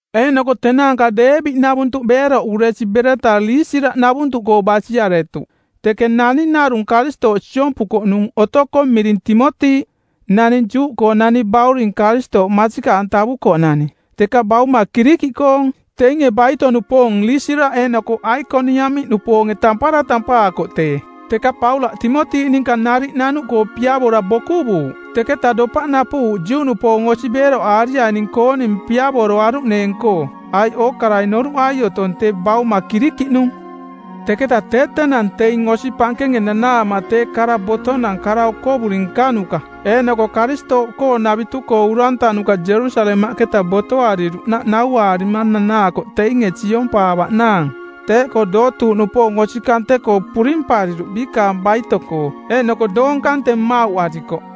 Eeꞌnoko tenaanka Deebi-navuntuꞌ beeroꞌuresi bereta Liisiraꞌnavuntuꞌkoo basiaretuꞌ. Teke naning narung Karistooꞌ siompukoꞌnung otokoꞌ miring Timoti, nani Juꞌkoonani bauring Karistooꞌ masikaꞌantavukoꞌnani, teka bauma Kirikiꞌkoong. Teinge baito-nupoong Liisiraꞌ eeꞌnoko Aikoniamiꞌnupoonge tampara tampaakoꞌ tee. Teka Paulaꞌ Timoti ninka nariꞌ nanuꞌkoo piavora bokuvuuꞌ, teketaꞌ dopaꞌ napuꞌuuꞌ Juꞌnupoong osi beeroꞌaariaining-kooning piavoroaruꞌneeng-koo, aiꞌ ookarai noruꞌai otoing tee bauma Kirikiꞌnung. Teketa tee tenang teing osi pankenge nanaama tee kara botonang kara okovuri nkanuka eeꞌnoko Karistooꞌkoonavitu-koo urantanuka Jerusalemaꞌketa botoariruꞌnaꞌ nauaarima nanaakoꞌ teinge siompaavaꞌnaang. Teeꞌkoo dootuuꞌnupoong osi kante-koo purimpariruꞌ biikaang baito-koo, eeꞌnoko doong kante mmauꞌarikoꞌ.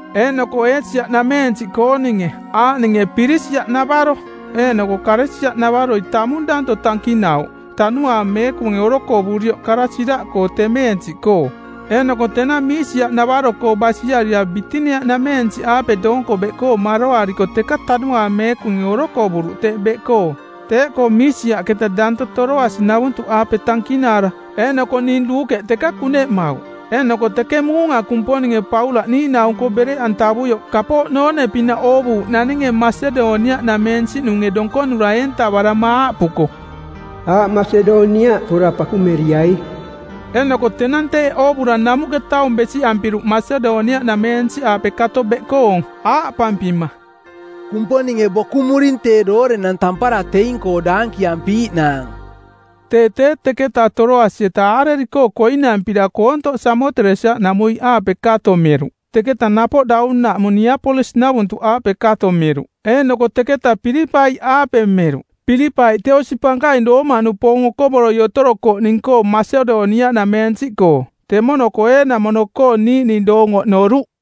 Eeꞌnoko Eesia-nameensiꞌkooninge aaꞌninge Pirisiaꞌnavaro eeꞌnoko Kalesia-navaroi tamung danto tankinauꞌ Tanuaang Meekunge orokovurioꞌ kara siraꞌkoo temeensiꞌkoo. Eeꞌnoko tenang Miisiaꞌnavaro-koo basiarira Bitinia-nameensiꞌaape doonko beꞌkoo maroariko teka Tanuaang Meekunge orokovuruꞌ teꞌ beꞌkoo. Teeꞌkoo Miisiaꞌketa danto Toroasi-navuntuꞌaape tankinaara eeꞌnoko ning Luukeꞌ teka kuneꞌmauꞌ. Eeꞌnoko teke muunga Kumponinge Paulaꞌ niiꞌnaung-koo˜ bereꞌantavuioꞌ kapooꞌ noone-pinaꞌ oovuuꞌ naninge Masedoniaꞌnameensiꞌnunge donkonura eentavarama aaꞌpuko, “Aꞌ Masedoniaꞌ pora pakumeriai.” Eeꞌnoko tenang teeꞌ oovura namuꞌke taung besiꞌampiruꞌ Masedoniaꞌnameensiꞌaape kato beꞌkoong, aaꞌpampima, “Kumponinge bokumuring tee doorenang tampara teing-koo daankiampiiꞌnaang.” Tee tee teketa Toroasi-eta aareri-koo koinampira koontoꞌ Samoteresia-namuiꞌaape kato meruꞌ, teketa napoꞌ daunaꞌmung Niapolis-navuntuꞌaape kato meruꞌ. Eeꞌnoko teketa Pilipai-aape meruꞌ. Pilipai tee osi pankaing Roomaꞌnupoong okovoroi otorokoꞌning-koo Masedoniaꞌnameensiꞌkoo. Temono-koo eeꞌnamono-koo niiꞌning doong oꞌnoruꞌ.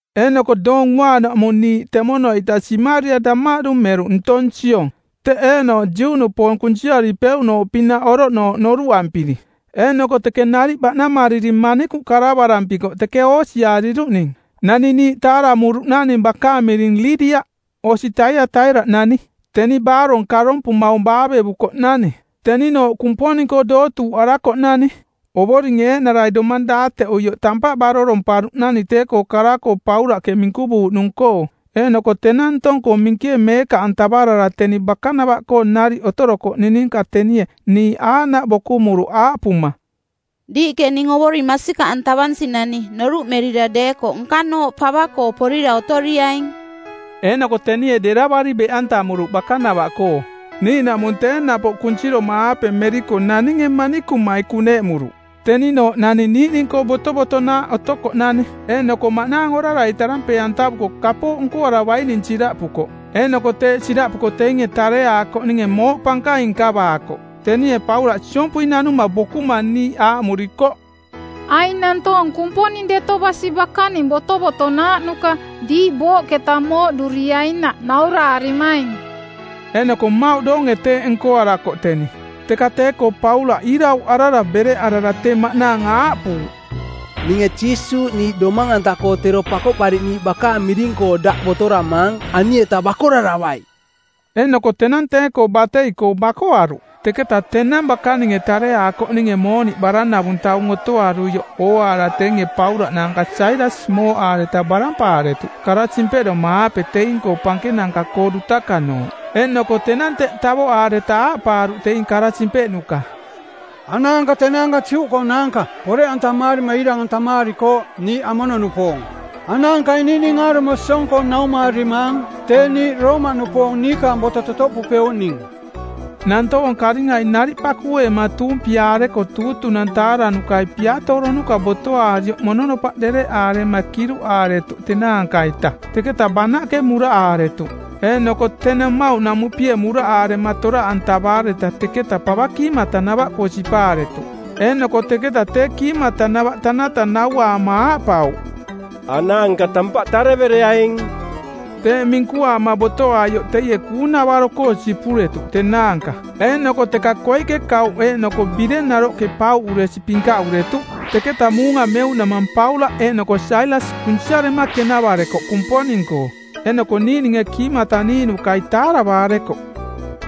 Eeꞌnoko Doong Uaanaꞌmung niiꞌ temono-ita simarira damaꞌdu meruꞌ ntong siong, teꞌ eeꞌnooꞌ Juꞌnupoong kunsiaripeuꞌnooꞌpinaꞌ oroꞌnooꞌ noruꞌampiri. Eeꞌnoko teke nariꞌ baꞌnamariri manikuꞌ karavarampikoꞌ teke oosiariruꞌning. Nani niiꞌ taaramuruꞌnani bakaang miring Liidia, osi Taiataira-nani. Teni baarong karompumaung baavevukoꞌnani; teninooꞌ Kumponing-koo dootuuꞌarakoꞌnani. Ovoringe eeꞌnarai domang daateꞌuioꞌ tampaꞌ baroromparuꞌnani tee-koo kara-koo Paulaꞌke minkuvuuꞌnung-koo. Eeꞌnoko tenang ntong-koo minkie meekaꞌantavarara teni bakanava-koo nariꞌ otorokoꞌning ninka tenie niiꞌ aaꞌnaꞌ bokumuruꞌ aaꞌpuma, “Diiꞌke ning Ovoring masikaꞌantavansinani noruꞌmerira deekoꞌ nkanooꞌ pava-koo porira otoriaing.” Eeꞌnoko tenie deravari beꞌantamuruꞌ bakanava-koo. Niiꞌnaꞌmung tee napoꞌ kunsiroma-aape meriko naninge manikumai kuneꞌmuruꞌ. Teninooꞌ naning niiꞌning-koo botovotonaaꞌ otokoꞌnani eeꞌnoko maꞌnaang orarai tarampee˜antavuko kapooꞌ nkoaravaining siraꞌpukoꞌ, eeꞌnoko teeꞌ siraꞌpuko teinge tareaakoꞌninge mooꞌ pankaing nkavaakoꞌ. Tenie Paulaꞌ siompui nanuma bokuma niiꞌ aaꞌmurikoꞌ, “Aing nantoong Kumponing Deto Basi bakaning botovotonaaꞌnuka diiꞌ booꞌketa mooꞌduriainaꞌ nauraarimaing.” Eeꞌnoko mmauꞌ doonge teeꞌ nkoarakoꞌ teni. Teka tee-koo Paulaꞌ iirauꞌarara bereꞌarara tee maꞌnaang aaꞌpuuꞌ, “Ninge Jiisuuꞌ niiꞌ domang-anta-koo tero Pakoꞌpariꞌniiꞌ bakaang miring-koo daꞌ botoramaang ani-eta bakoraravai!” Eeꞌnoko tenang tee-koo batei-koo bakoaruꞌ. Teketa tenang bakaninge tareaakoꞌninge mooniꞌ baranavung taung otoaruioꞌ ooaara teinge Paulaꞌ naanka Sailas mooꞌaareta barampaaretuꞌ kara simpeꞌdoma-aape teing-koo pankenanka-koo dutakanooꞌ. Eeꞌnoko tenang teꞌ tavoꞌaareta aaꞌpaaruꞌ teing kara simpeꞌnuka˜, “Anaanka tenaanka Juꞌkoonaanka. Poreꞌantamaarima iirang-antamaarikooꞌ niiꞌ amono-nupoong. Anaankai niiꞌning aarumo siong-koo naumaarimaang tee niiꞌ Roomaꞌnupoong niikaang boto totoꞌpupeuꞌning.” Nantoong karingai nariꞌ pakueema tuumpiaareko tuutunang˜ taaranukai piatooronuka botoaarioꞌ mononopaꞌ dereꞌaama kiruꞌaaretuꞌ tenaanka-ita, teketa banaꞌke muraꞌaaretuꞌ. Eeꞌnoko tenang mmauꞌnamuꞌpie muraꞌaarema toraꞌantavaareta teketa pava kiimatanava-koo sipaaretuꞌ. Eeꞌnoko teketa tee kiimatanava tanata nauaama aaꞌpauꞌ, “Anaanka tampaꞌ tarevereaing.” Teeꞌ minkuaama botoaioꞌ teie kuung-navaro-koo sipuretuꞌ tenaanka eeꞌnoko teka koiꞌke kauꞌ eeꞌnoko bireng naroꞌke pauꞌuresi pinkaꞌuretuꞌ. Teketa muunga meuꞌnamang Paulaꞌ eeꞌnoko Sailas kunsiarema kenavarekoꞌ Kumponing-koo eeꞌnoko niiꞌninge kiimata-niiꞌnukai taaravaarekoꞌ.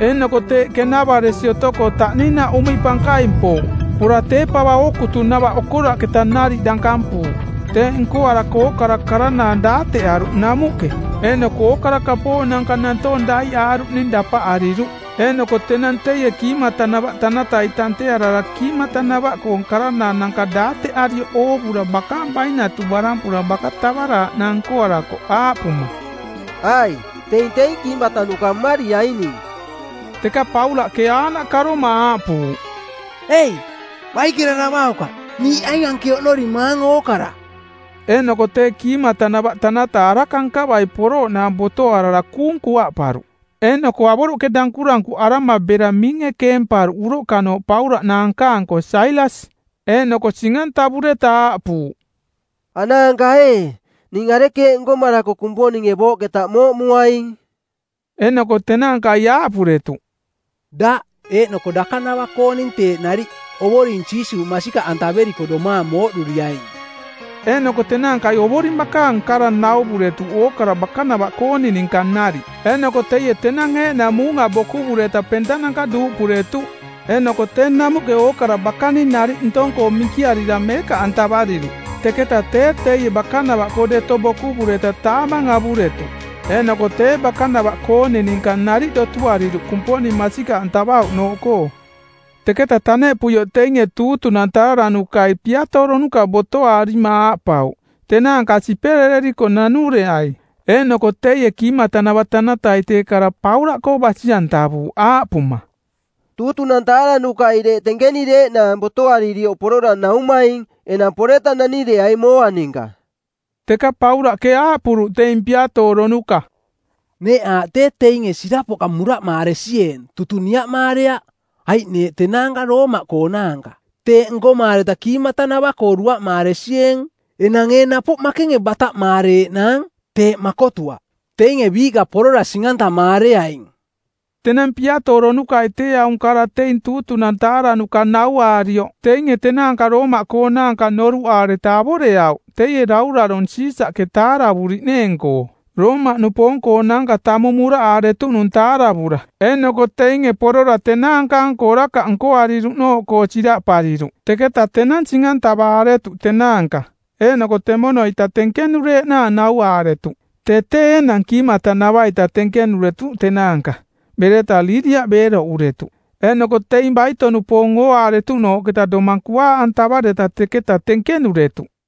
Eeꞌnoko teeꞌ kenavaresi otoko taꞌninaꞌ uꞌmiꞌ pankaing pouꞌ, pora tee pava ookutunava okoraꞌketa nariꞌ dankampuuꞌ. Teeꞌ nkoarako ookara karanaang daateꞌaruꞌ namuꞌke, eeꞌnoko ookara kapooꞌnanka nantoong daiꞌaaruꞌning dapaꞌariruꞌ. Eeꞌnoko tenang teie kiimatanava tanatai tantearara kiimatanava-koong karanaananka daateꞌarioꞌ oovura bakaang bainatu barampura baka tavaraaꞌnaang nkoarakoꞌ aaꞌpuma, “Ai, teing teing kiimatanuka mmariaining!” Teka Paulaꞌke aaꞌnaꞌ karoma aaꞌpuuꞌ, “Ei, Baikeraravaukaꞌ! Niiꞌ aing anke oꞌnorimaang ookara.” Eeꞌnoko tee kiimatanava tanata araka nkavai porooꞌnaang botoarara kuung kuaꞌparuꞌ, eeꞌnoko avoroꞌke dankurankuꞌarama bera miinge keemparuꞌ uroꞌkanooꞌ Paulaꞌ naanka-anko Sailas. Eeꞌnoko sing-antavureta aaꞌpuuꞌ, “Anaanka ee, ning arekeeꞌ nkomarako Kumponinge booꞌketa mooꞌmuaing?” Eeꞌnoko tenaankai aaꞌpuretuꞌ, “Daꞌ, eeꞌnoko dakanava-kooning teeꞌ nariꞌ, Ovoring Jiisuuꞌ masikaꞌantaveriko domaang mooꞌduriaing.” Eeꞌnoko tenaankai Ovoring bakaang kara nauvuretuꞌ ookara bakanava-kooning ninka nariꞌ. Eeꞌnoko teie tenang eeꞌnang muunga bokuvureta pentananka duuꞌpuretuꞌ, eeꞌnoko tee namuꞌke ookara bakaning nariꞌ ntong-koo minkiarira meekaꞌantavariruꞌ. Teketa tee teie bakanava-koo deto bokuvureta taamang avuretuꞌ, eeꞌnoko tee bakanava-kooning ninka nariꞌ dotuariruꞌ Kumponing masikaꞌantavauꞌnooꞌkoo. Teketa taneꞌpuioꞌ teinge tuutunang taaranukai˜ piatooronuka botoaarima aaꞌpauꞌ, “Tenaanka siperereriko nanureai.” Eeꞌnoko teie kiimatanava tanatai tee kara Paulaꞌkoo basi-antavuuꞌ aaꞌpuma, “Tuutunang taaranukai deeꞌ tenkenireeꞌnaang botoaarioꞌ porora naumaing, enang poreta nanireaing mooa ninka.” Teka Paulaꞌke aaꞌpuruꞌ teing piatooronuka, “Neeꞌ aaꞌ tee teinge sirapoꞌka muraꞌmaaresieeng tutung niaꞌmaareaꞌ, aiꞌ neeꞌ tenaanka Roomaꞌkoonaanka. Teeꞌ nkomaareta kiimatanava-koo duaꞌmaaresieeng. Enang ee napoꞌ makenge bataꞌmaareeꞌnaang? Teeꞌ makotuaꞌ. Teinge biiꞌka porora sing-antamaareaing.” Tenang piatooronukai tee aung kara teing tuutunang taaranuka nauaarioꞌ teinge tenaanka Roomaꞌkoonaanka noruꞌaareta avoreauꞌ teie dauraronge Siisaꞌke tavuriꞌneeng-koo, Roomaꞌnupoong-koonaanka tamung muraꞌaaretuꞌnung taaravura. Eeꞌnoko teinge porora tenaanka-anko orakaꞌ nkoariruꞌnooꞌkoo siraꞌpariruꞌ. Teketa tenang sing-antavaaretuꞌ tenaanka eeꞌnoko temono-ita tenkenureeꞌnaang nauaaretuꞌ. Tee tee enang kiimatanava-ita tenkenuretuꞌ tenaanka, bereta Liidia beeroꞌuretuꞌ. Eeꞌnoko teing baito-nupoong ooaaretuꞌnooꞌketa domang kuaaꞌantavaareta teketa tenkenuretuꞌ.